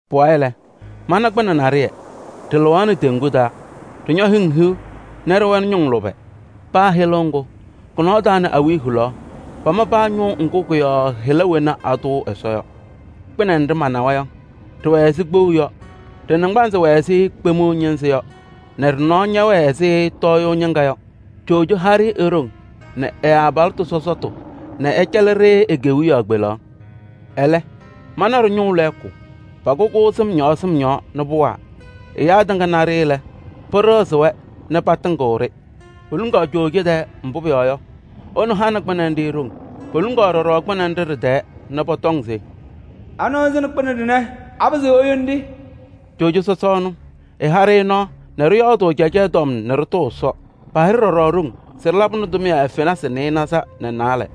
Pʋwayɩ lɛ, mana kpɩnɛ naɖɩyɛ, ɖɩlɩɣaɣnɩ teŋgu taa. Ɖɩñɔ hɩŋ hiu nɛ ɖɩwɛnɩ ñʋŋ lʋbɛ. Paa hɩlʋʋ ŋgʋ kʋ-nɔɔ taa nɛ awiya hulaɣ, pama paa ñʋʋ ŋgʋ kʋ-yɔɔ hɩla wena atʋʋ Ɛsɔ yɔ. Kpɩnɛ nɖɩ manawa yɔ, ɖɩwɛ ɛzɩ kpou yɔ. Ɖɩ-naŋgbanzɩ wɛ ɛzɩ kpemiɣa ñɩnzɩ yɔ nɛ ɖɩ-nɔɔ ñɛwɛɛ ɛzɩ tɔɔyʋʋ ñɩŋga yɔ. Coojo ha-ɖɩ e-ɖoŋ nɛ ɛ-abalɩtʋ sɔsɔtʋ nɛ ɛcɛlɩ-ɖɩ e-kewiyaɣ kpelaɣ. Ɛlɛ, mana ɖɩ-ñʋʋ lɛɛkʋ, pʋkʋ-kʋ sɩm yɔɔ sɩm yɔɔ nɛ pʋwaa. Ɛyaa tɩŋa na-ɖɩ lɛ, pɩɖɩɣzɩ-wɛ nɛ patɩŋɩɣ-ɖɩ. Poluŋaɣ coojo tɛɛ, mbʋ pʋyɔɔ yɔ, ɛnʋ hanɩ kpɩnɛ nɖɩ ɖoŋ. Poluŋaɣ ɖɔɖɔ kpɩnɛ nɖɩ ɖɩ-tɛɛ nɛ pɔtɔŋ se: “Anɩɣzɩnɩ kpɩnɛ ɖɩnɛ? Apɩzɩɣ eyoni-ɖɩ?” Coojo sɔsɔ ɛnʋ, ɛha-ɖɩ nɔɔ nɛ ɖɩyɔɔdʋʋ akaɣya tɔm nɛ ɖɩtʋʋ Ɛsɔ. Paha-ɖɩ ɖɔɖɔ ɖoŋ se ɖɩlabɩnɩ tʋmɩyɛ fenasɩ nɩɩnaza nɛ naalɛ.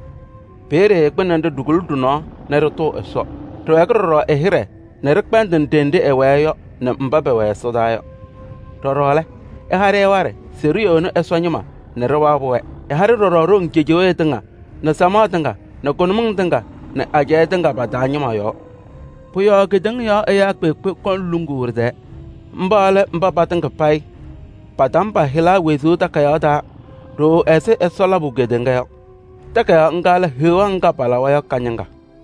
Peeye kpɩnɛ nɖɩ ɖikuli ɖɩ-nɔɔ nɛ ɖɩtʋʋ Ɛsɔ. Ɖɩwɛɛkɩ ɛ-hɩɖɛ nɛ ɖɩkpɛndɩnɩ ɖenɖe ɛwɛɛ yɔ nɛ mba pɛwɛ ɛsɔdaa yɔ. Ɖɔɖɔ lɛ, ɛha-ɖɩ waɖɛ se ɖiyoni Ɛsɔ ñɩma nɛ ɖɩwabɩ-wɛ. Ɛha-ɩ ɖɔɖɔ ɖoŋ cejewee tɩŋa nɛ samaɣ tɩŋa nɛ kʋnʋmɩŋ tɩŋa nɛ ajɛɛ tɩŋa pa-taa ñɩma yɔɔ. Pʋ-yɔɔ kedeŋa yɔɔ ɛyaa kpeekpe kɔŋ luŋuu ɖɩ-tɛɛ. Mba lɛ mba patɩŋa payɩ patama pa-hɩla wezuu takayaɣ taa ɖooo ɛzɩ Ɛsɔ labʋ kedeŋa yɔ. Takayaɣ ŋga lɛ Heɣa ŋga palawa yɔ ka-ñɩŋga.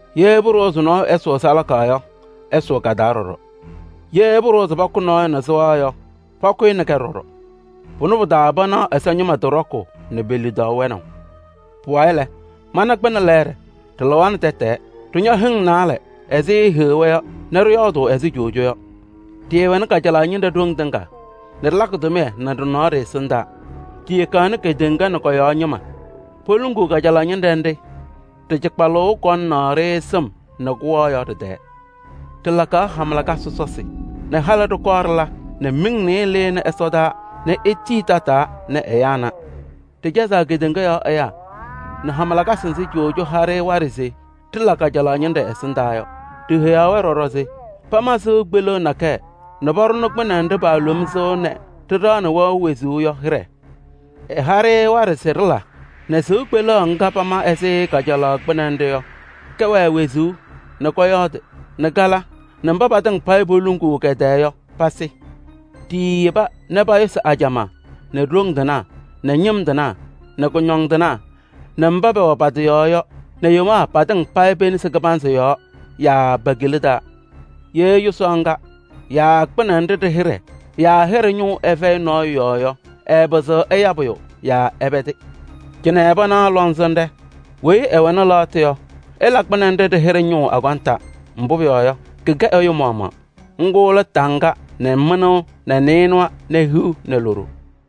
Ye pʋɖʋwa se nɔɔyʋ ɛsʋʋ salaka yɔ, ɛsʋʋ ka-taa ɖɔɖɔ. Ye pʋɖʋwa se pakʋ nɔɔyʋ nɛ sɩɣa yɔ, pakʋʋ-ɩ nɛ kɛ ɖɔɖɔ. Pʋnɛ pɩ-taa panaɣ Ɛsɔ ñɩma tɩ ɖɔkʋʋ nɛ pe-lidaʋ wɛnaʋ. Pʋwayɩ lɛ, mana kpɩnɛ lɛɛɖɛ, ɖɩlɩɣaɣnɩ tɛtɛɛ. Ɖɩñɔ hɩŋ naalɛ ɛzɩ heɣa yɔ nɛ ɖɩyɔɔdʋʋ ɛzɩ coojo yɔ. Ɖɩɩwɛnɩ kajalaɣ ñɩnɖɛ ɖoŋ tɩŋa nɛ ɖɩlakɩ tʋmɩyɛ nɛ ɖɩ-nɔɔ ɖɩ-ɛsɩndaa. Ɖiyekaɣ nɛ kedeŋa nɛ kɔ-yɔɔ ñɩma poluŋuu kajalaɣ ñɩnɖɛ nɖɩ ɖɩ-kɩcɩkpʋʋ kɔŋaɣnɩ-ɖɩ sɩm nɛ kʋwaa yɔ ɖɩ-tɛɛ. Ɖɩlakaɣ hama lakasɩ sɔsɔsɩ nɛ halɩ ɖɩkɔɔ ɖɩla nɛ miŋ nɩɩyɩ lɩnɩ ɛsɔdaa nɛ etii tataa nɛ ɛyaa na. Ɖɩcɛzaɣ kedeŋa yɔɔ ɛyaa nɛ hama lakasɩ nzɩ coojo ha-ɖɩ waɖɛ se ɖɩla kajalaɣ ñɩnɖɛ ɛsɩndaa yɔ. Ɖiheyaɣ-wɛ ɖɔɖɔ se pama sɩʋ kpeleɣ nakɛyɛ nɛ paɖʋnɩ kpɩnɛ nɖɩ paalom sɩɣa nɛ ɖɩɖaɣnɩ wɛʋ wezuu yɔ hɩɖɛ. Ɛha-ɖɩ waɖɛ se ɖɩla nɛ sɩʋ kpeleɣ ŋga pama ɛzɩ kajalaɣ kpɩnɛ nɖɩ yɔ, kɛwɛɛ wezuu nɛ kɔyɔɔdɩ nɛ kala nɛ mba patɩŋa payɩ paaluŋuu kɛ-tɛɛ yɔ, pasɩ. Ɖiiyeba nɛ payʋsɩ ajamaa nɛ ɖoŋ tɩnaa nɛ ñɩm tɩnaa nɛ kʋñɔndɩnaa nɛ mba pɛwɛ pa-tɩ yɔɔ yɔ nɛ yomaa patɩŋa payɩ pe-nesi kɩbanzɩ yɔɔ yaa pe-kila taa. Ye yʋsaɣ ŋga yaa kpɩnɛ nɖɩ ɖɩ-hɩɖɛ yaa ɖɩ-hɩɖɛ ñʋʋ ɛfɛyɩ nɔɔyʋ yɔɔ yɔ, ɛɛpɩzɩɣ ɛya pʋyʋ yaa ɛpɛdɩ. Cɩnɛ panaɣ lɔŋsɩnɖɛ: weyi ɛwɛnɩ lɛɣtʋ yɔ, ɛla kpɩnɛ nɖɩ ɖɩ-hɩɖɛ ñʋʋ akɔnta. Mbʋ pʋyɔɔ yɔ, kɩkɛ ɛyʋ mayaɣ. Ŋgʋ lɛ taŋga nɛ mɩnʋʋ nɛ nɩɩnʋwa nɛ hiu nɛ loɖo.